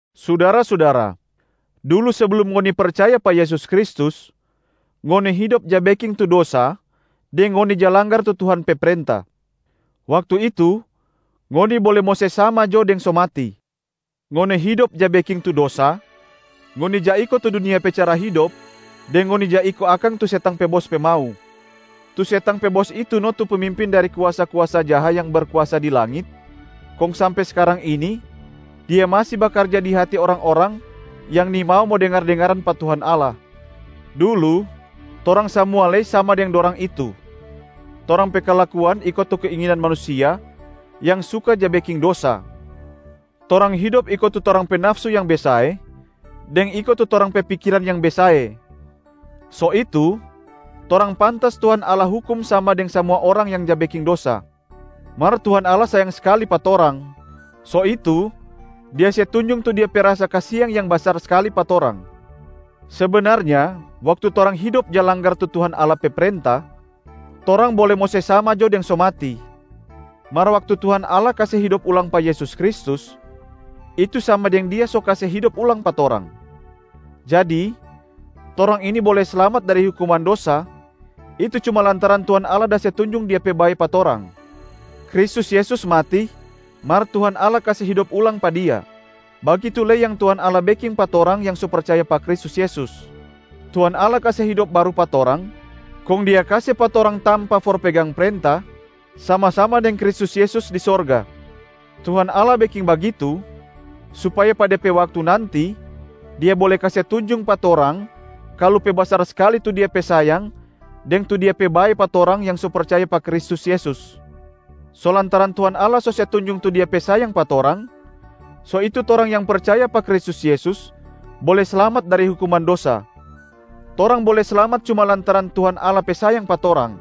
Sudara-sudara, dulu seblum ngoni percaya pa Yesus Kristus, ngoni hidop ja beking tu dosa deng ngoni ja langgar tu Tuhan pe prenta. Waktu itu, ngoni bole mo se sama jo deng so mati. Ngoni hidop ja beking tu dosa, ngoni ja iko tu dunia pe cara hidop deng ngoni ja iko akang tu setang pe bos pe mau. Tu setang pe bos itu no tu pemimpin dari tu kuasa-kuasa jaha yang berkuasa di langit, kong sampe skarang ini dia masi bakarja di hati orang-orang yang nimau mo dengar-dengaran pa Tuhan Allah. Dulu torang samua lei sama deng dorang itu, torang pe kalakuan iko tu keinginan manusia yang suka ja beking dosa, torang hidop iko tu torang pe nafsu yang besae deng iko tu torang pe pikiran yang besae. So itu, torang pantas Tuhan Allah hukum sama deng samua orang yang ja beking dosa. Mar Tuhan Allah sayang skali pa torang, so itu Dia se tunjung tu Dia pe rasa kasiang yang pe basar skali pa torang. Sebenarnya waktu torang hidop ja langgar tu Tuhan Allah pe prenta, torang bole mo se sama jo deng so mati. Mar waktu Tuhan Allah kase hidop ulang pa Yesus Kristus, itu sama deng Dia so kase hidop ulang pa torang. Jadi, torang ini bole slamat dari hukuman dosa, itu cuma lantaran Tuhan Allah da se tunjung Dia pe bae pa torang. Kristus Yesus mati, mar Tuhan Allah kase hidop ulang pa Dia, bagitu lei yang Tuhan Allah beking pa torang yang so percaya pa Kristus Yesus. Tuhan Allah kase hidop baru pa torang, kong Dia kase pa torang tampa for pegang prenta sama-sama deng Kristus Yesus di sorga. Tuhan Allah beking bagitu supaya pa de pe waktu nanti Dia bole kase tunjung pa torang kalu pe basar skali tu Dia pe sayang deng tu Dia pe bae pa torang yang so percaya pa Kristus Yesus. So lantaran Tuhan Allah so se tunjung tu Dia pe sayang pa torang, so itu torang yang percaya pa Kristus Yesus bole slamat dari hukuman dosa. Torang bole slamat cuma lantaran Tuhan Allah pe sayang pa torang,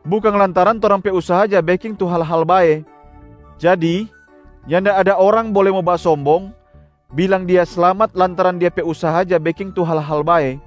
bukang lantaran torang pe usaha ja beking tu hal-hal bae. Jadi nyanda ada orang bole mo basombong bilang dia slamat lantaran dia pe usaha ja beking tu hal-hal bae.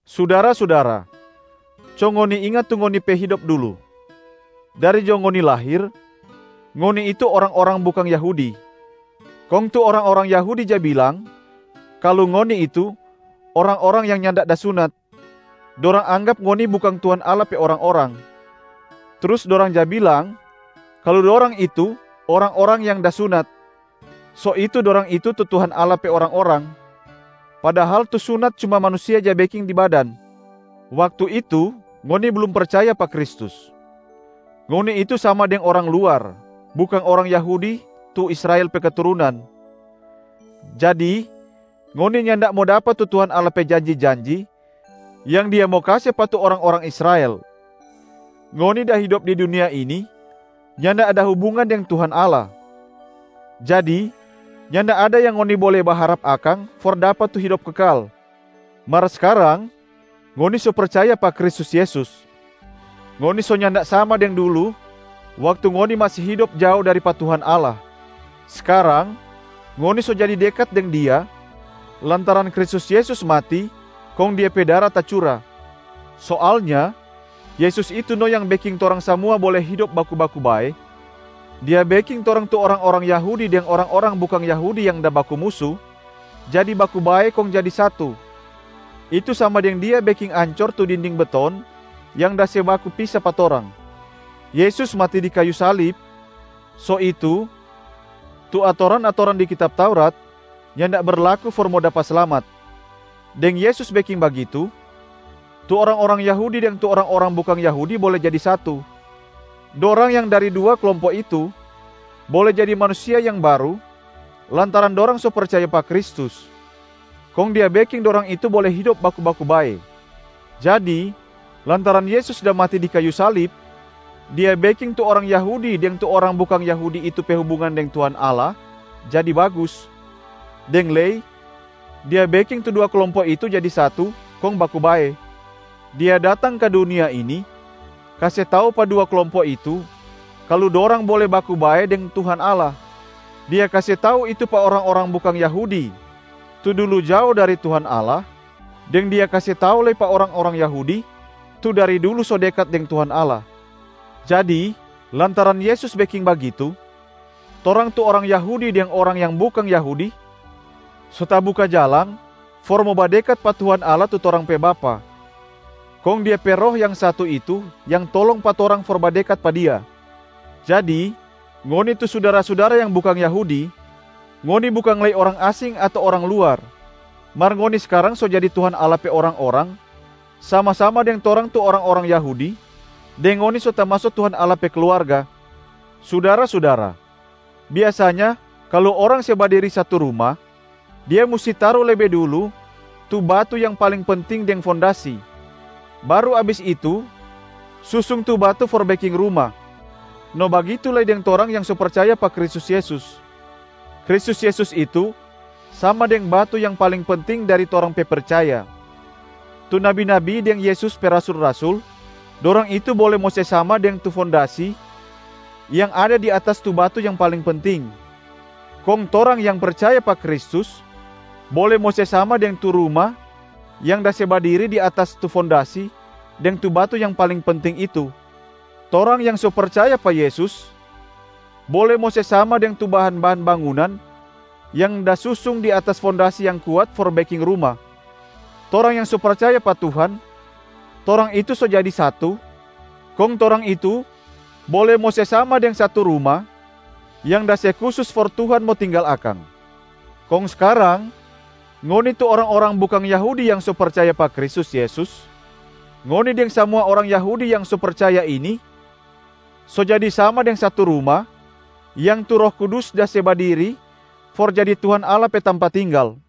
Sudara-sudara, co ngoni inga tu ngoni pe hidop dulu. Dari jo ngoni lahir, ngoni itu orang-orang bukang Yahudi. Kong tu orang-orang Yahudi ja bilang kalu ngoni itu ‘orang-orang yang nyanda da sunat’, dorang anggap ngoni bukang Tuhan Allah pe orang-orang. Trus dorang ja bilang kalu dorang itu ‘orang-orang yang da sunat’, so itu dorang itu tu Tuhan Allah pe orang-orang. Padahal tu sunat cuma manusia ja beking di badan. Waktu itu, ngoni blum percaya pa Kristus. Ngoni itu sama deng orang luar, bukang orang Yahudi tu Israel pe keturunan. Jadi ngoni nyanda mo dapa tu Tuhan Allah pe janji-janji yang Dia mo kase pa tu orang-orang Israel. Ngoni da hidop di dunia ini nyanda ada hubungan deng Tuhan Allah, jadi nyanda ada yang ngoni bole baharap akang for dapa tu hidop kekal. Mar skarang ngoni so percaya pa Kristus Yesus, ngoni so nyanda sama deng dulu waktu ngoni masi hidop jao dari pa Tuhan Allah, skarang ngoni so jadi dekat deng Dia lantaran Kristus Yesus mati kong Dia pe dara tacura. Soalnya Yesus itu no yang beking torang samua bole hidop baku-baku bae. Dia beking torang tu orang-orang Yahudi deng orang-orang bukang Yahudi yang da baku musu jadi baku bae kong jadi satu, itu sama deng Dia beking ancor tu dinding beton yang da se baku pisa pa torang. Yesus mati di kayu salib, so itu tu atoran-atoran di kitab Taurat nyanda berlaku for mo dapa slamat. Deng Yesus beking bagitu, tu orang-orang Yahudi deng tu orang-orang bukang Yahudi bole jadi satu. Dorang yang dari dua klompo itu bole jadi manusia yang baru lantaran dorang so percaya pa Kristus, kong Dia beking dorang itu bole hidop baku-baku bae. Jadi lantaran Yesus da mati di kayu salib, Dia beking tu orang Yahudi deng tu orang bukang Yahudi itu pe hubungan deng Tuhan Allah jadi bagus, deng lei Dia beking tu dua klompo itu jadi satu kong baku bae. Dia datang ka dunia ini kase tau pa dua klompo itu kalu dorang bole baku bae deng Tuhan Allah. Dia kase tau itu pa orang-orang bukang Yahudi tu dulu jao dari Tuhan Allah, deng Dia kase tau lei pa orang-orang Yahudi tu dari dulu so dekat deng Tuhan Allah. Jadi lantaran Yesus beking bagitu, torang tu orang Yahudi deng orang yang bukang Yahudi so tabuka jalang for mo badekat pa Tuhan Allah tu torang pe Bapa, kong Dia pe Roh yang satu itu yang tolong pa torang for badekat pa Dia. Jadi, ngoni tu sudara-sudara yang bukang Yahudi, ngoni bukang lei orang asing ato orang luar, mar ngoni skarang so jadi Tuhan Allah pe orang-orang sama-sama deng torang tu orang-orang Yahudi, deng ngoni so tamaso Tuhan Allah pe kluarga. Sudara-sudara, biasanya kalu orang se badiri satu ruma dia musti taru lebe dulu tu batu yang paling penting deng fondasi, baru abis itu susung tu batu for beking ruma. No bagitu lei deng torang yang percaya pa Kristus Yesus. Kristus Yesus itu sama deng batu yang paling penting dari torang pe percaya. Tu nabi-nabi deng Yesus pe rasul-rasul, dorang itu bole mo se sama deng tu fondasi yang ada di atas tu batu yang paling penting. Kong torang yang percaya pa Kristus bole mo se sama deng tu ruma yang da se badiri di atas tu fondasi deng tu batu yang paling penting itu. Torang yang so percaya pa Yesus bole mo se sama deng tu bahan-bahan bangunan yang da susung di atas fondasi yang kuat for beking ruma. Torang yang so percaya pa Tuhan, torang itu so jadi satu, kong torang itu bole mo se sama deng satu ruma yang da se kusus for Tuhan mo tinggal akang. Kong skarang ngoni tu orang-orang bukang Yahudi yang so percaya pa Kristus Yesus, ngoni deng samua orang Yahudi yang so percaya ini so jadi sama deng satu ruma yang tu Roh Kudus da se badiri for jadi Tuhan Allah pe tampa tinggal.